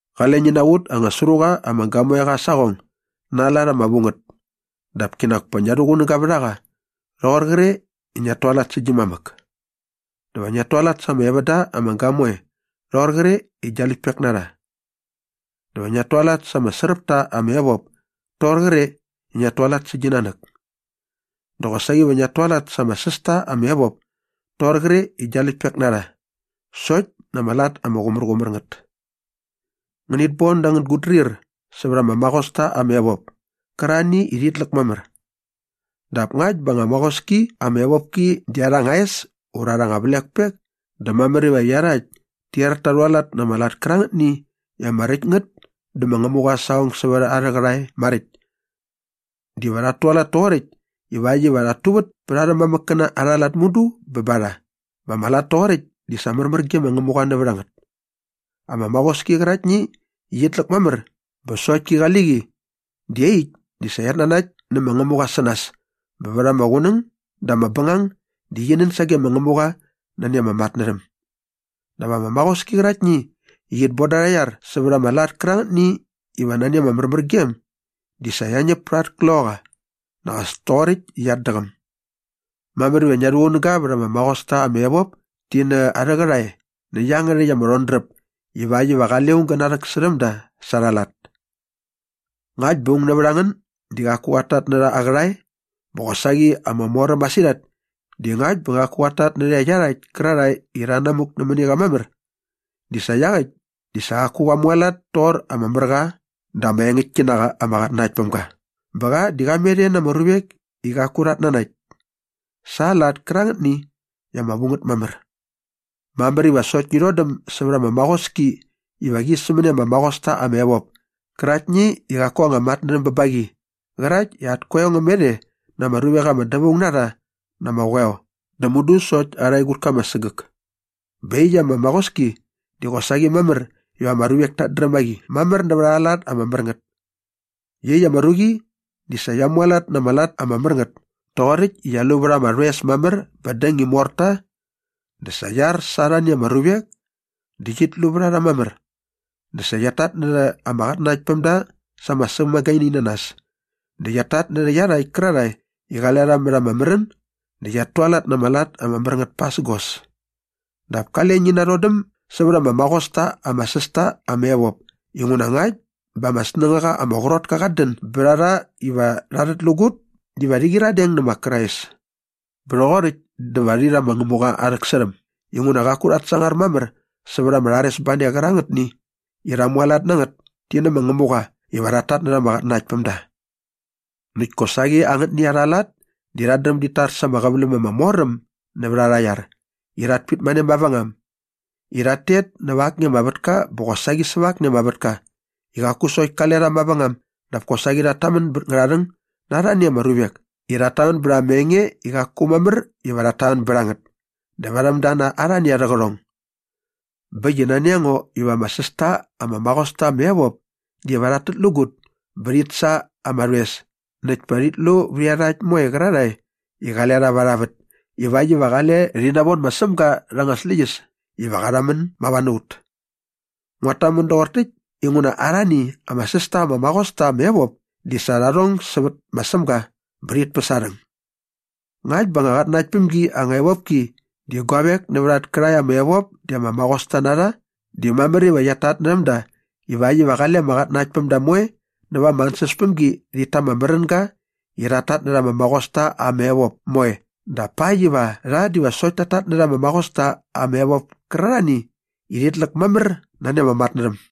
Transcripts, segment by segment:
Qale ngi naqut anga sru qa ama gamoeqa aa saqong na aa lat ama vu ngät dap kinak pa ngia rhuqunäga vät a qa rhoqor qre i ngiat tualat sä gi mamäk. Dä va ngiat tualat sa ama evända ama gamoe rhoqor qre i gia läktpek na rha dä va ngiat tualat sa ama sräp ta ama evop toqor qre i ngiat tualat sä gi nanäk dä qosaqi va ngiat tualat sa ama säs ta ama evop toqor qre i gia läktpek na rha sokt na ama lat ama qumärqumär ngät. Ngänit bon dä angän gutdrir sävät ama maqosta ama evop kärarhani i rhit läk mamär. Dap ngakt bä anga maqoski ama evopki di arha anga es ura arha anga vlekpek dä mamär iva iarhakt ti er ta rhualat na ama lat kärangätni i ama räkt ngät dä ma Ngämuqa aa saqong sävät arhä qärhae maräkt. Diva rhat tualat toqoräkt ivakt iva rhat tuvät pät arhä mamäkkäna arha lat mudu bä ba rha bä ama lat toqoräkt di sa märmär ge ma Ngämuqa nävät a ngät. Ama maqoski qäraktni i qit läk mamär bä sokt ki qali qi di iaqyäkt di sa qiat nanakt nä ma Ngämuqa sä nas bä vät ama qunäng dä näp bängang di qi nän sage ma Ngämuqa nani ama matnärhäm. Dap ama maqoski qäraktni i qit boda arha iar sävät ama lat kärangätni iva nani ama märmärgem di sa qia ñäp pät at kloqaqa nak as toqoräkt i qiat däqäm. Mamär iva ngia rhuqunäga vät ama maqosta ama evop ti na arhä qärhae nä iangärhäkt ama rhodräp ivakt iva qale aung gä narhäksärhäm da sa arha lat. Ngakt bä aung nävät a ngän di qaku qat tatnärha aa qärhae bä qosaqi ama moräm masirhat di ngakt bä qaku qat tatnärhä iarhakt kärarhae i rha namuk nämäni qa mamär di sa iaqäkt di sa qaku qa mualat toqor ama mär qa dä ama engäktki na qa ama qatnanaktpämga bä qa di qa met e na ama ruvek i qaku rhat nanakt sa aa lat kärangätni i ama vu ngät mamär. Mamär iva sokt ngi rhodäm sävät ama maqoski iva qi sämäni ama maqos ta ama evop käraktni i qaku anga matnärhäm bä ba qi qärakt i at koeo ngä met e na ama ruvek ama dävaung na rha na ama qoeo dä mudu sokt arha egutka ama sägäk bä iaqyäkt ama maqoski di qosaqi mamär iva ama ruvek tat dräm a qi mamär nävät arha lat ama mär ngät. Iaqyäkt ama ruqi di sa qia mualat na ama lat ama mär ngät toqoräkt i qia lu vät ama rhoes mamär bä däng i mor ta dä sa qia ar sa arhani ama ruvek dä qit lu vät a rha mamär dä sa qiat tatnärha ama qatnanaktpämda sa ama sämagaininanas dä qiat tatnärhä iarhakt kärarhae i qale rha mät ama märän dä qiat tualat na ama lat ama mär ngät pasägos. Dap kale ngi narhodäm sävät ama maqos ta ama säs ta ama evop inguna ngakt bä ama snängaqa ama qrot ka qat dän bät a rha iva rha rhätlägut diva rhi qyiradeng nä ma Krais bä rhoqoräkt dä va rhi rha ma Ngämuqa aa rhäksärhäm inguna qaku rhat sangar mamär sävät ama rharesbane qärangätni i rha mualat na ngät ti nä ma Ngämuqa iva rhat tatnärha ama qatnanaktpämda. Näkt kosaqi angätni arha lat di rhat dräm dit tar sa ama qäväläm ama mor äm nävät arha iar i rhat pitmane mavängam i rhat tet näva akni ama vätka bä qosaqi säva akni ama vätka i qaku sokt kale rha mavängam dap kosaqi rhat tamän bä ngärharhäng na arhani ama ruvek i rhat tamän bät ama enge i qaku mamär iva rhat tamän bät a ngät dä varhäm da na arhani arhä qärhong. Bä äkt i nani a ngo iva ama säs ta ama maqos ta ama evop diva rhat tätlägut bä rhit sa ama rhoes näkt pa rhit lu vät iarhakt moe qärarhae i qale rha va arha vät ivakt iva qale rhi navon ma Sämga rha anga släqyäs iva qa rhamän mava na ut. Nguat tamän doqor täkt inguna arhani ama säs ta ama maqos ta ama evop di sa rha rhong sävät ma Sämga bä rhit päs aa rhäng. Ngakt bä anga qatnanakt päm gi anga evopki di guavek nävät at kärhae ama evop di ama maqosta na rha di mamär iva qiat tatnärhäm da ivakt iva qale ama qatnanaktpämda moe näva ama ansäspämgi rhit ta ama märänga i rhat tatnärha ama maqosta ama evop moe dap pakt iva rha diva sokt tat tatnärha ama maqosta ama evop kärarhani i rhit läk mamär nani ama matnärhäm.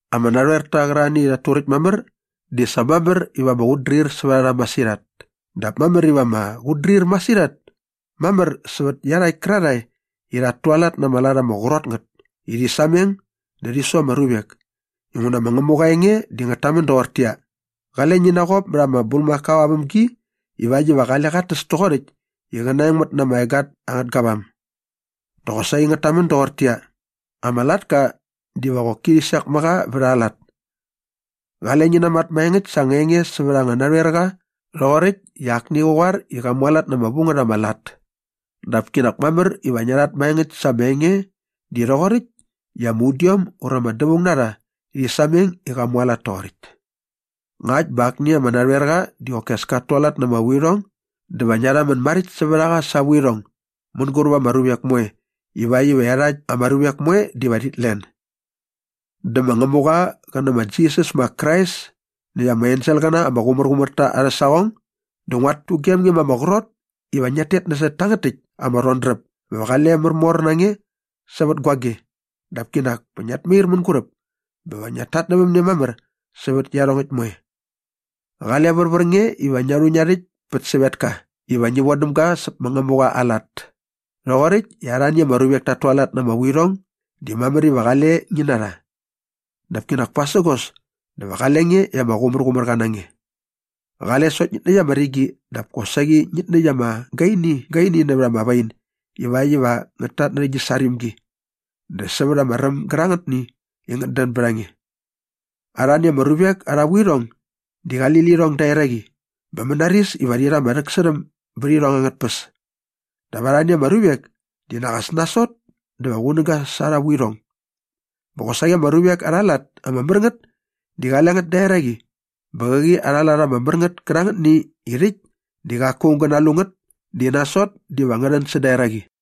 Ama narhoerta qärarhani i rhat turäkt mamär di sa mamär iva ama qutdrir sävät a rha masirhat dap mamär iva ama qutdrir masirhat mamär sävät iarhakt kärarhae i rhat tualat na ama lat ama qrot ngät i rhi sameng dä rhi su ama ruvek inguna ma Ngämuqa aa enge di ngät tamän doqortäqyia, “Qale ngi naqop mät ama bulmakao aa vämgi ivakt iva qale qat täs toqoräkt i qä naengmät na ama egat angät gavam.” Dä qosaqi ngät tamän doqortäqyia, “Ama latka diva qoki rhi sek mä qa vät aa lat.” Qale ngi namat maengäkt sa anga enge sävät anga narhoerqa rhoqoräkt i akni qä qoar i qa mualat na ama vu ngät ama lat dap kinak mamär iva ngia rhat maengäkt sa ama enge di rhoqoräkt i ama udiom ura ama dävaung na rha rhi sameng i qa mualat toqoräkt. Ngakt bä akni ama narhoerqa di qoki as kat tualat na ama vuirhong dä va ngia rhamän maräkt sävät a qa sa aa vuirhong mänguräp ama ruvek moe ivakt iva iarhakt ama ruvek moe diva rhit len. Dä ma Ngämuqa qä nä ma Jisas ma Krais näkt ama enselqäna ama qumärqumär ta arhä saqong dä nguat tugem nge ma ama qrot iva ngiat tet nasot tangät täkt ama rhodräp bä va qale märmor na nge sävät guage dap kinak pa ngiat mair mänguräp bä va ngiat tatnävämne mamär sävät iarhongäkt moe. Qale värvär nge iva ngia rhu ngia rhäkt pät sävetka iva ngi vodäm ga säp ma Ngämuqa aa lat. Rhoqoräkt i arhani ama ruvek tat tualat na ama vuirhong di mamär iva qale ngi na rha. Dap kinak pasägos diva qale nge i ama qumärqumärqa na nge. Qale sokt ngit näkt ama rigi dap kosaqi ngit näkt ama gainigaini nävät ama wain ivakt iva ngät tatnärhä gi sarimgi dä sävät ama räm gärangätni i ngät dän bät a nge. Arhani ama ruvek arha vuirhong di qali lirhong da eraqi bä mänaris iva rhi rha ama rhäksärhäm bät irhong angät tpäs. Dap arhani ama ruvek di nak as nasot dä va qunäga sa arha vuirhong. Bä qosaqi ama ruvek arha lat ama mär ngät di qale ngät da eraqi bä qäqi arha lat ama mär ngät kärangätni i rhäkt di qaku aung gä nalu ngät di nasot diva ngä rhän säda eraqi.